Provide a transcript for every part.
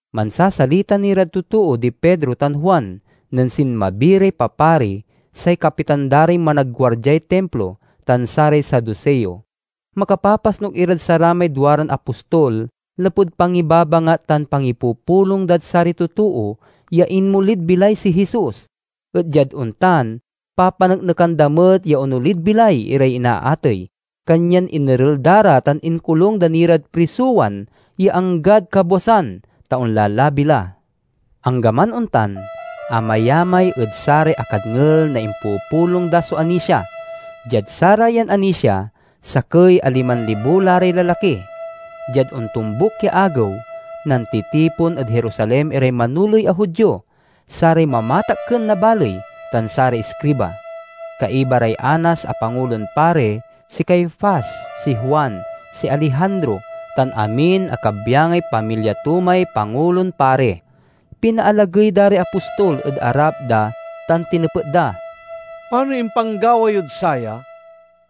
Mansasalita ni rad totoo di Pedro tan Juan nen sinmabi ray papari, say kapitan da ray managguardiay Timplo, tan saray Saduseo. Makapapasnuk irad saramay duaran apostol lapud pangibabangat tan pangipupulong dad saray totoo ya inmolid bilay si Jesus, et diad ontan, papaneknekan da met ya onolid bilay iray inaatey. Kanyan inerel da ra tan inkolung da ni rad prisowan ya anggad kabwasan, ta onlalabi la. Anggaman ontan, amayamay ed saray akadngel na impupulong da so anisia. Diad sarayan anisia, sakey a liman libo la ray lalaki. Diad ontombuk ya agew, nantitipon ed Jerusalem iray manoley a Judio, saray mamatakken na baley, tan saray iskriba. Kaiba ray Anas a Pangulon Pari, si Caifas, si Juan, si Alejandro, tan amin a kabyangay pamilya to may Pangulon Pari. Pinaalagey da ray apostol ed arap da tan tinepet da, "Panoy impanggawa yod saya?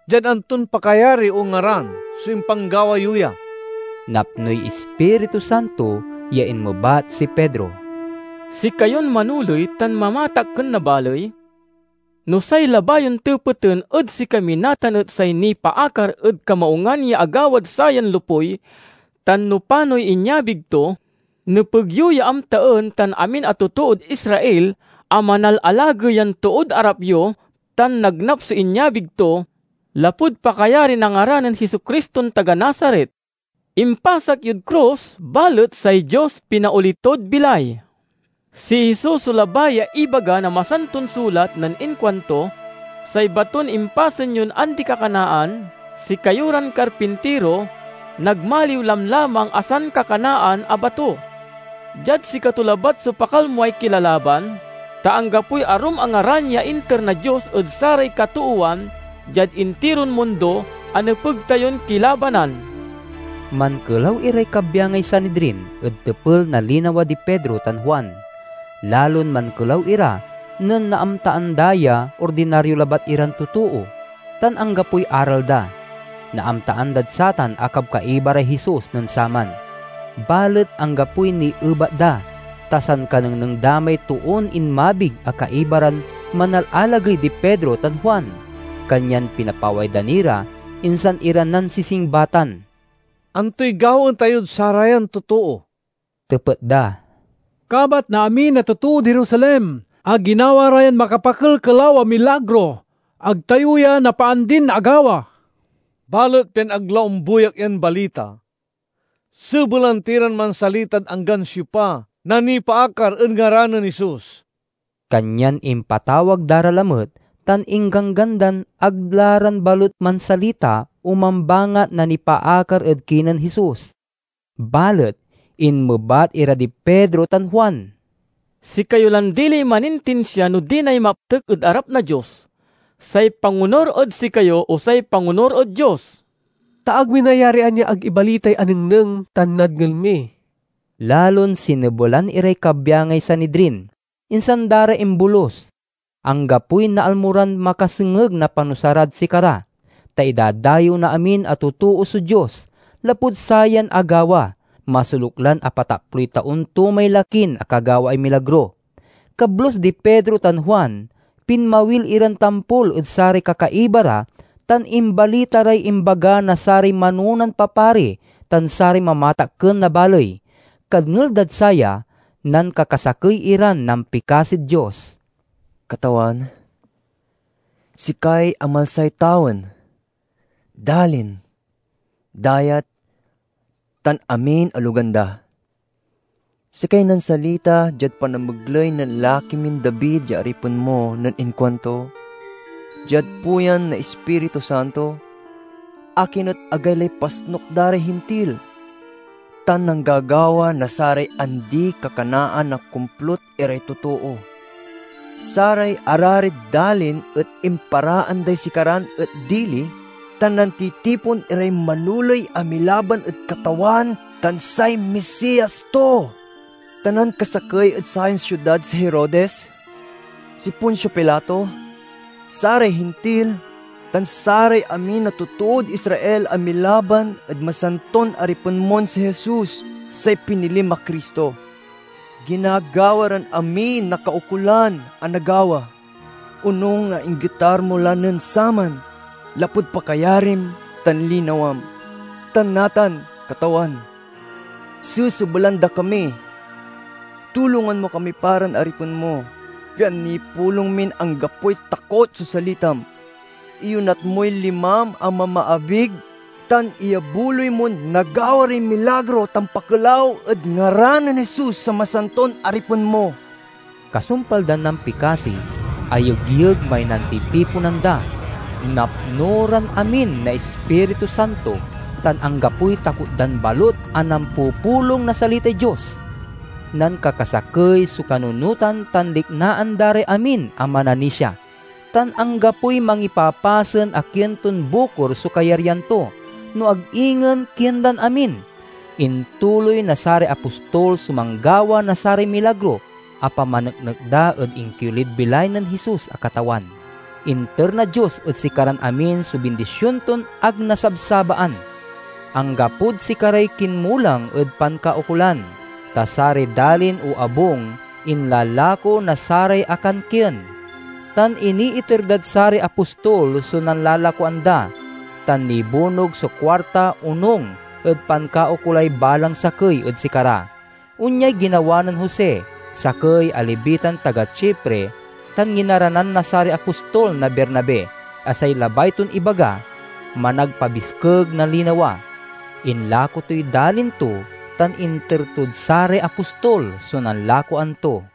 Diad anton pakayari o ngaran so impanggawa yo ya?" Napnoy Ispiritu Santo ya inmebat si Pedro, "Sikayon manoley tan mamatakken na baley, no say labay yon tepeten ed sikami natan et say nipaakar ed kamaungan ya agawad sayan lopuy tan no panoy inyabig to, nepeg yo ya amtaen tan amin a totood Israel, a manalalagey yan tood arap yo tan nagnap so inyabig to, lapud pakayari na ngaran nen Jesu-Criston taga Nazaret. Impasak yod krus, balet say Dios pinaoli tod bilay. Si Jesus so labay ya ibaga na Masanton Sulat nen inkuanto, 'Say baton impasen yon andikakanaan, sikayo ran karpintiro, nagmaliw lamlamang a sankakanaan a bato.' Diad sikato labat so pakalmoay kilalaban, ta anggapoy arum a ngaran ya inter na Dios ed saray katoowan diad intiron mundo a nepeg tayon kilabanan." Mankelaw iray kabyangay Sanidrin ed tepel na linawa di Pedro tan Juan. Lalon mankelaw ira nen naamtaan da ya ordinario labat iran totoo, tan anggapoy aral da. Naamtaan dad satan a kabkaiba ray Jesus nen saman. Balet anggapoy niebat da, ta sankanengneng da may toon inmabig a kaiba ran manalalagey di Pedro tan Juan. Kanyan pinapaway da ni ra, insan ira nansisingbatan. "Antoy gawaen tayod sarayan totoo?" tepet da. "Kabat na amin a totood Jerusalem a ginawa ra yan makapakelkelaw a milagro. Ag tayo ya napaandin agawa! Balet pian ag la ombuyak yan balita, sebelan ti ran mansalitad anggan siopa na nipaakar ed ngaran nen Jesus." Kanyan impatawag da ra lamet tan ingganggan dan ag la ran balut mansalita o mambangat na nipaakar ed kinen Jesus. Balet inmebat ira di Pedro tan Juan, "Sikayo lan diliy manintinsia no dinay maptek ed arap na Dios: say pangonur ed sikayo, o say pangonur ed Dios. Ta ag mi nayarian ya ag ibalitay anengneng tan nadngel mi." Lalon sinebelan iray kabyangay Sanidrin, insan da ra imbolus. Anggapoy naalmo ran makasengeg na panusa rad sikara, ta idadayew na amin a totoo so Dios, lapud sayan agawa. Masoluk lan apataploy taon to may lakin akagawaay milagro. Kablus di Pedro tan Juan, pinmawil iran tampol ed saray kakaiba ra tan imbalita ray imbaga na saray manonan papari tan saray mamatakken na baley. Kadngel dad saya, nankakasakey iran nampikasid Dios: "Katawan, sikay amalsay tawen, dalin, dayat, tan amin a logan da! Sikay nansalita diad panamegley nen laki min David ya aripen mo nen inkuanto, diad puyan na Ispiritu Santo, 'Akin et agaylay pasnuk da ray Hintil, tan nanggagawa na saray andikakanaan a komplut iray totoo? Saray ararid dalin et imparaan day sikaran et dili, tan nantitipon iray manoley a milaban ed Katawan tan say Misias to!' Ta nankasakey ed sayan siudad si Herodes, si Poncio Pilato, saray Hintil, tan saray amin a totood Israel a milaban ed masanton Aripen mon si Jesus, say pinilim a Cristo. Ginagawa ran amiy nakaukolan a nagawa, onung na inggetar mo la nen saman lapud pakayarim tan linawam. Tan natan, Katawan, sasebelan da kami. Tulongan mo kami pa ran aripen mo, pian nipulong min anggapoy takot so salitam. Iyonat moy limam a mamaabig, tan iyabuloy mon nagawa ray milagro tan pakelaw ed ngaran nen Jesus a masanton Aripen mo." Kasumpal dan nampikasi, ayegyeg may nantitiponan da. Napno ran amin na Ispiritu Santo, tan anggapoy takot dan balut a nampupulong na salitay Dios. Nankakasakey so kanunotan tan liknaan da ray amin a mananisia, tan anggapoy mangipapasen a kien ton bukor so kayaryan to, no ag ingen kien dan amin. Intuloy na saray apostol so manggawa na saray milagro a pamaneknek da ed inkiolid bilay nen Jesus a Katawan. Inter na Dios ed sikaran amin so bindision ton ag nasabsabaan. Anggapod sikaray kinmulang ed pankaukolan, ta saray dalin o abung inlalako na saray akankien tan iniiter dad saray apostol so nanlalakoan da, tan nibunog so kuarta onung ed pankaukolay balang sakey ed sikara. Onyay ginawa nen Jose, sakey a Levitan taga Chipre, tan nginaranan na saray apostol na Bernabe (a say labay ton ibaga, "Managpabiskeg na Linawa"). Inlako toy dalin to tan inter tod saray apostol so nanlakoan to.